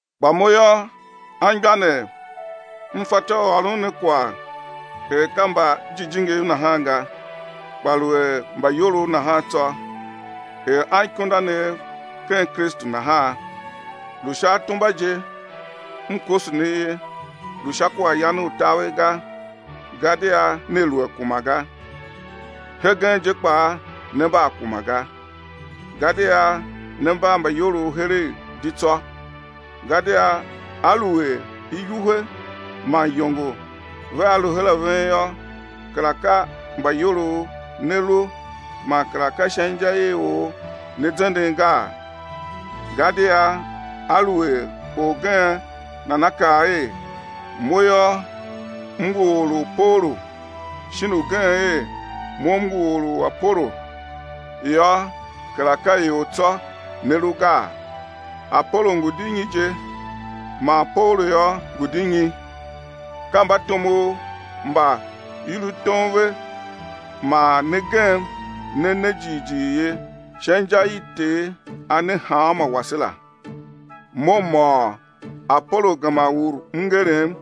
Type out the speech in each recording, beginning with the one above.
Kpa mo yô, anmgbianev m fatyô u ôron ne kwagh er ka mbajijingiv nahan ga, kpa lu er mbaiyolov nahan tsô, er anikundanev ken Kristu nahan. Lu sha atumba je m koso ne ye, lu sha kwaghyan u taver ga, gadia ne lu a kuma ga. Hegen je kpaa ne mba a kuma ga, gadia ne mba mbaiyolov heregh di tsô, gadia aluer iwuhe man iyongo vea lu her a ven yô, kera ka mbaiyolov ne lu, man kera ka sha inja i or ne zenden gaa? Gadia aluer orgen nana kaa er: Mo yô, m ngu or u Paulu, shin ugen er: Mo m ngu or u Apolo, yô, kera ka ior tsô ne lu gaa? Apolo ngu di nyi je? Man Paulu yô, ngu di nyi? Ka mbatomov mba i lu tom ve man ne gem ne ne jighjigh ye, sha inja i Ter A ne hanmô wase la. Mo m môôr. Apolo gema ur mngerem,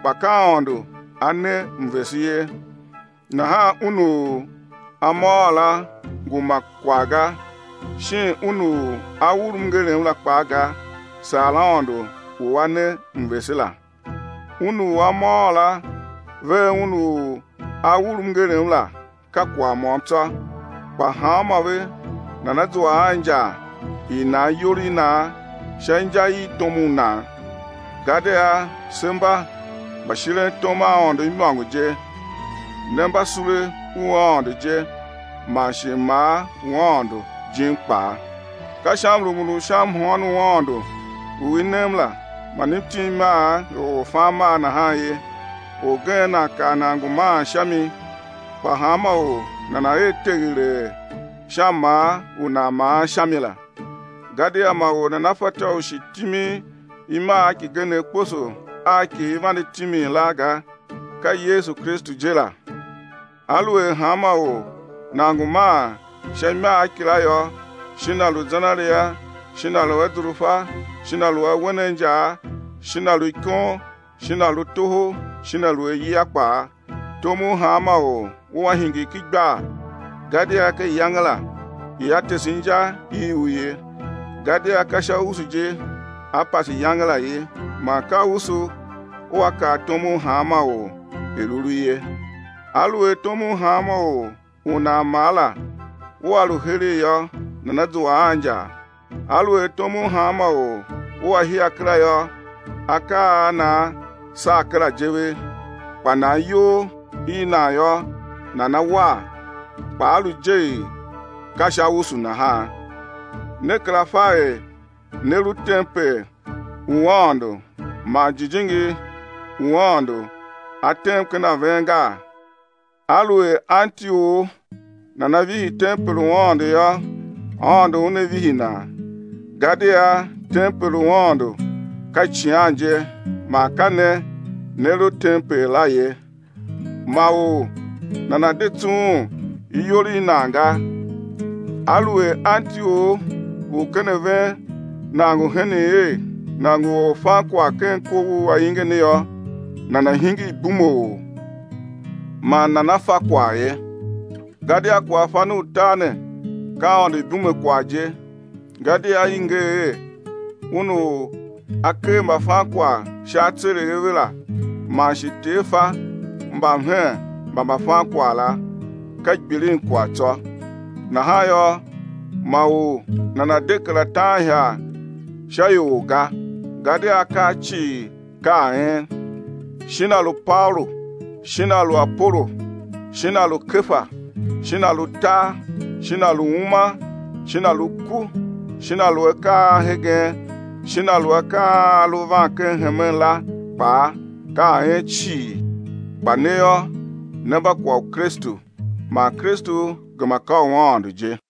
kpa ka Aôndo A ne mvese ye. Nahan un u a môôr la ngu ma kwagh ga, shin un u a ur mngerem la kpaa ga, saa Aôndo u A ne mvese la. Un u a môôr la vea un u a ur mngerem la ka kwagh môm tsô, kpa hanmô ve nana zua a injar i nan iyol i nan sha inja i tom u nan. Gadia se mba mbashirentom a Aôndo imôngo je, ne mba sule u Aôndo je, man shi mmaa u Aôndo jim kpaa. Ka sha mrumun u sha mhôôn u Aôndo u i nem la man m tim imagh er orfanmaa nahan ye, orgen nan kar nan ngu maan sha mi, kpa hanma or nana̱ er teghelee sha mmaa u nan maan sha mi la. Gadia ma or nana fatyô u shi timin imagh kigenegh kposo a ki i vande timin la ga, ka Yesu Kristu je la. Aluer hanma or nan ngu maan sha imagh kila yô, shin a lu zenaria shin a lu azurfa shin a lu awen a injaa shin a lu ikon shin a lu toho shin a lu ayia kpaa, tom u hanma or ua hingir ken igbar, gadia ka iyange la ia tese inja i u ye, gadia ka sha usu je á pase iyange la ye, man ka usu ua kar tom u hanma or, er u lu ye. Aluer tom u hanma or u nan maa la ua lu heregh yô, nana zua a injar. Aluer tom u hanma or ua hia kera yô, akaa a nan saa kera je ve, kpa nan iyol i nan yô, nana war, kpa á lu je er ka sha usu nahan. Ne kera fa er ne lu tempel u Aôndo man Jijingi u Aôndo A tem ken a ven gaa? Aluer anti or nana vihi tempel u Aôndo yô, Aôndo Una vihi nan, gadia tempel u Aôndo ka icighan je, man ka ne ne lu tempel la ye. Ma or nana̱ de tsughun iyol i nan ga. Aluer anti or u ken a ven nan ngu henen er nan ngu orfankwagh ken kov u ainge ne yô, nana̱ hingir ibumeor, man nana fa kwagh ye. Gadia kwaghfan u tar ne ka Aôndo ibumekwagh je. Gadia i nger er: Un u A ker mbafankwagh sha atseregh a ve la, man shi: Ter fa mbamhen mba mbafankwagh la, ka gbilinkwagh tsô. Nahan yô, ma or nana̱ de kera taan ihagh sha ior ga; gadia akaa cii ka a en, shin a lu Paulu shin a lu Apolo shin a lu Kefa shin a lu tar shin a lu uma shin a lu ku shin a lu akaa a hegen, shin a lu akaa a a lu van ken hemen la kpaa, ka a en cii. Kpa ne yô, ne mba kwagh u Kristu, man Kristu gema ka u Aôndo je.